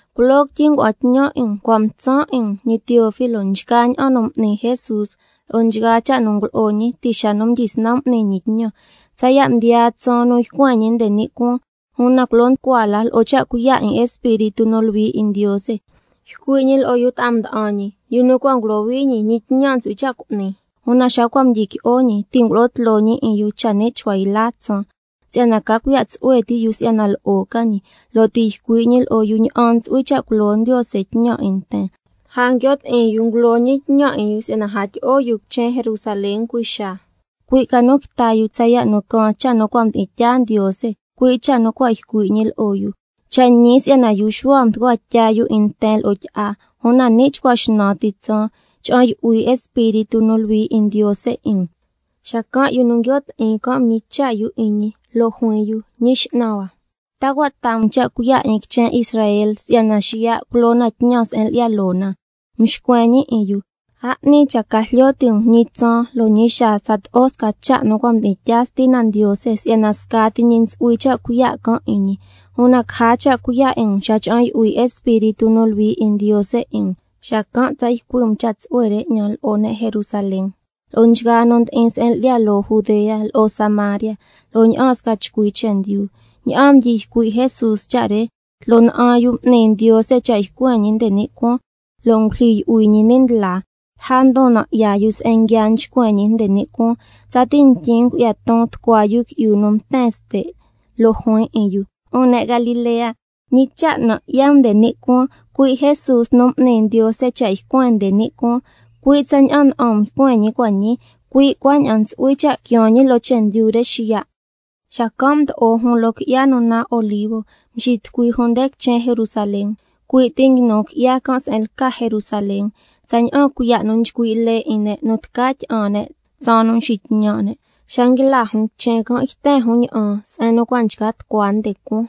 Culoo quityi ngua'an tñan 'in um, cua' mtsan' 'in um, ñi Teófilo, nchgaa ña'an nu m'ni Jesús lo'o nchgaa cha' nu ngulo'o ñi ti' xa nu mdyisnan m'ni ñi tñan, tsaya' mdiyaa tsaan nu ycuen ñi nde ni' cuaan. Una culo nducua la, lo'o cha' cuiya' 'in Espíritu nu Luhui 'in Ndiose ycui' ñi lo'o yu ta'a mda'an ñi, yu nu cua' ngulohui ñi, ñi tñan ntsu'hui cha' cu'ni. Una xa cua' mdyiqui'o ñi, ti' ngulo'o tloo ñi 'in yu cha ni' chcua yla tsaan, si'yana ca cuiya' tsu'hue ti yu si'yana lo'o ca ñi, ti' ycui' ñi lo'o yu ña'an ntsu'hui cha' culo Ndiose tñan 'in nten. Lja nguio' ti'in yu ngulo ñi tñan 'in yu si'yana a tyi'o yu quichen Jerusalén cui' xaa, cui' ca nu quita yu tsaya' nu caan cha' nu cua' mdi'in tyaa Ndiose, cui' cha' nu cua' ycui' ñi lo'o yu: Cha' ñi si'yana yu Xuhua mducua tya yu 'in nten lo'o tyi'a, una ni' chcua xnan ti tsaan, cha'an yu'hui Espíritu nu Luhui 'in Ndiose 'in um. Xacan' yu nu nguio' ti'in can' mñicha' yu 'in ñi, lo' juin yu: Ñi X'nan hua, ¿ta cua' taa um cha' cuiya' 'in quichen Israel si'yana xiya' culo na tñan se'en lyi'ya loo na? Mxcuen ñi 'in yu: A 'ni cha' ca jlyo ti' um ñi tsaan lo' ñi xaa tsato'o sca cha' nu cua' mdi'in tyaa Stina Ndiose, si'yana scati ñi ntsu'hui cha' cuiya' can' 'in ñi, una caja cha' cuiya' 'in um xa cha'an yu'hui Espíritu nu Luhui 'in Ndiose 'in um, xacan' tsa ycui' um cha' tsu'hue re 'ñan lo'o ne' Jerusalén, lo'o nchgaa nu ndi'in se'en lyi'ya loo Judea, lo'o Samaria, lo'o ña'aan sca chcui chendyu. Ña'aan mdyi ycui' Jesús cha' re, tloo na'an yu m'ni Ndiose cha' ycuen ñi nde ni' cuaan, lo' ngulyijyi yu'hui ñi ni' ndlaa. Lja ndon nan' 'ya yu se'en nguia nchcuen ñi nde ni' cuaan, tsati ntyin ngu'ya ton tucua yu qui'yu nu mten ste', lo' juin lo'o yu: 'Un ne' Galilea, ¿ñi cha' nan' 'ya um nde ni' cuaan? Cui' Jesús, ñi nu m'ni Ndiose cha' ycuen nde ni' cuaan, cui' tsaña'an na'an um ycuen ñi cua' ñii, cui' cuaña'an ntsu'hui cha' quiaan ñi loo chendyu re xiya'. Xacan' mdo'o jun loo qui'ya nu naan Olivo, mxitucui jun nde quichen Jerusalén. Cui' ti nguinu qui'ya can' se'en lca Jerusalén, tsaña'an cuiya' nu nchcui' lee 'in ne' nu tca tyi'an ne' tsaan nu nxitñan' ne'. Xa nguila jun quichen can', yten jun ña'an se'en nu cua' nchca tucua nde cuaan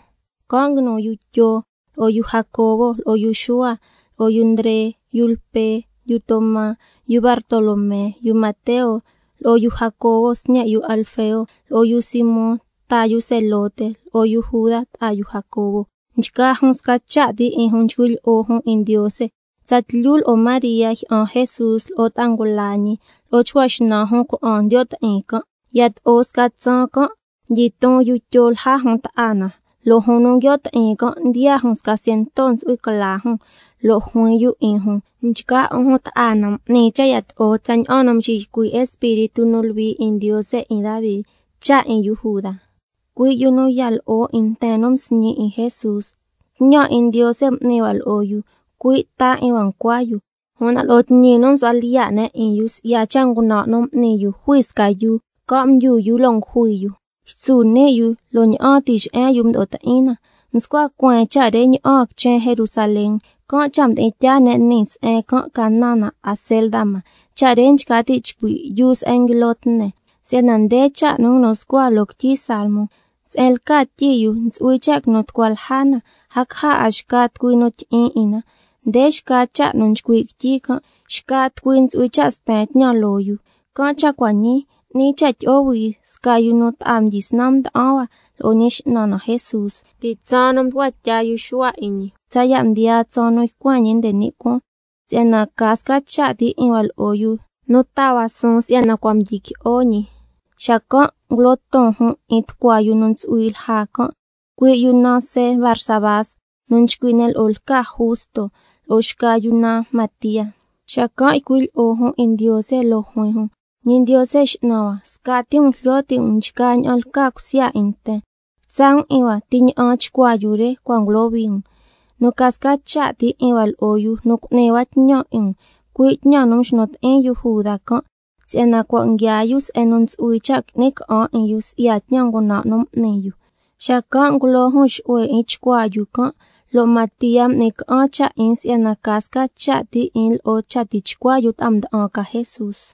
se'en nguinu yu Tyo, lo'o yu Jacobo, lo'o yu Xuhua, lo'o yu Ndre, yu Lpe, yu Toma, yu Bartolomé, yu Mateo, lo'o yu Jacobo sñe' yu Alfeo, lo'o yu Simón ta yu Zelote, lo'o yu Juda ta'a yu Jacobo. Nchgaa jun sca cha' ti 'in jun nchcui' lyi'o jun 'in Ndiose, tsatlyu lo'o María jyi'an Jesús, lo'o ta'a ngula ñi, lo'o chcua xnan jun cuna'an ndiyo' ti'in can'. Yato'o sca tsaan can', mdyiton yu Tyo lja jun ta'a na, (lo' jun nu nguio' ti'in can', ndiyaa jun sca ciento ntsu'hui cla jun), lo' juin yu 'in jun: Nchgaa 'un jun ta'a na, m'ni cha' yato'o tsaña'an nu mxiycui' Espíritu nu Luhui 'in Ndiose 'in Davi cha' 'in yu Juda, cui' yu nu ya lo'o 'in nten nu msñi 'in Jesús. Tñan 'in Ndiose m'ni hua lo'o yu, cui' ta 'in hua ncua yu. Una lo'o tñi nu msu'hua lyiya' ne' 'in yu si'ya cha' ngunan' nu m'ni yu, msi'i ne' sca yuu, lo' se'en mchcan' tucui yu mdyu yu loo yuu can', ytsu ni' yu, lo' ña'aan tixe'en yu mdo'o ti'in na. Mscua cueen cha' re ña'aan quichen Jerusalén, can' cha' mdi'in tyaa ne' nii se'en can' ca naan na Acéldama, cha' re nchca ti' chcui': Yuu se'en nguilo tne. Si'yana nde cha' nu nguinu scua loo quityi Salmo: —Se'en lca tyi yu, ntsu'hui cha' quinu tucua lja na, a caja 'a xca tucui nu ti' tyi'in 'in na—. Nde xca cha' nu nchcui' quityi can': —Xca tucui ntsu'hui cha' sten tñan loo yu—. Can' cha' cua' ñii, 'ni cha' tyi'o hui sca yu nu ta'a mdyisnan mda'an hua lo'o Ñi X'nan na Jesús, ti' tsaan nu mducua tya yu Xuhua 'in ñi, tsaya' mdiyaa tsaan nu ycuen ñi nde ni' cuaan, si'yana ca sca cha' ti 'in hua lo'o yu nu taa hua suun si'yana cua' mdyiqui'o ñi. Xacan' ngulo ton jun 'in tucua yu nu ntsu'hui lja can', cui' yu naan See Barsabás, nu nchcui' ne' lo'o lca Justo, lo'o xca yu naan Matía. Xacan' ycui' lyi'o jun 'in Ndiose, lo' juin jun: Ñi Ndiose X'nan hua, scati um jlyo ti' um nchgaa ña'an lca cusya 'in nten, quitsa' um 'in hua ti ña'an chcuaa yu re cua' ngulohui um, nu ca sca cha' ti 'in hua lo'o yu nu cu'ni hua tñan 'in um, cui' tñan nu mxnu ti'in yu Juda can', si'yana cua' nguiaa yu se'en nu ntsu'hui cha' qui'ni ca'an 'in yu si'ya tñan ngunan' nu m'ni yu. Xacan' ngulo jun xu'hue 'in chcuaa yu can', lo' Matía m'ni ca'an cha' 'in si'yana ca sca cha' ti 'in lo'o cha tixca yu ta'a mda'an ca Jesús.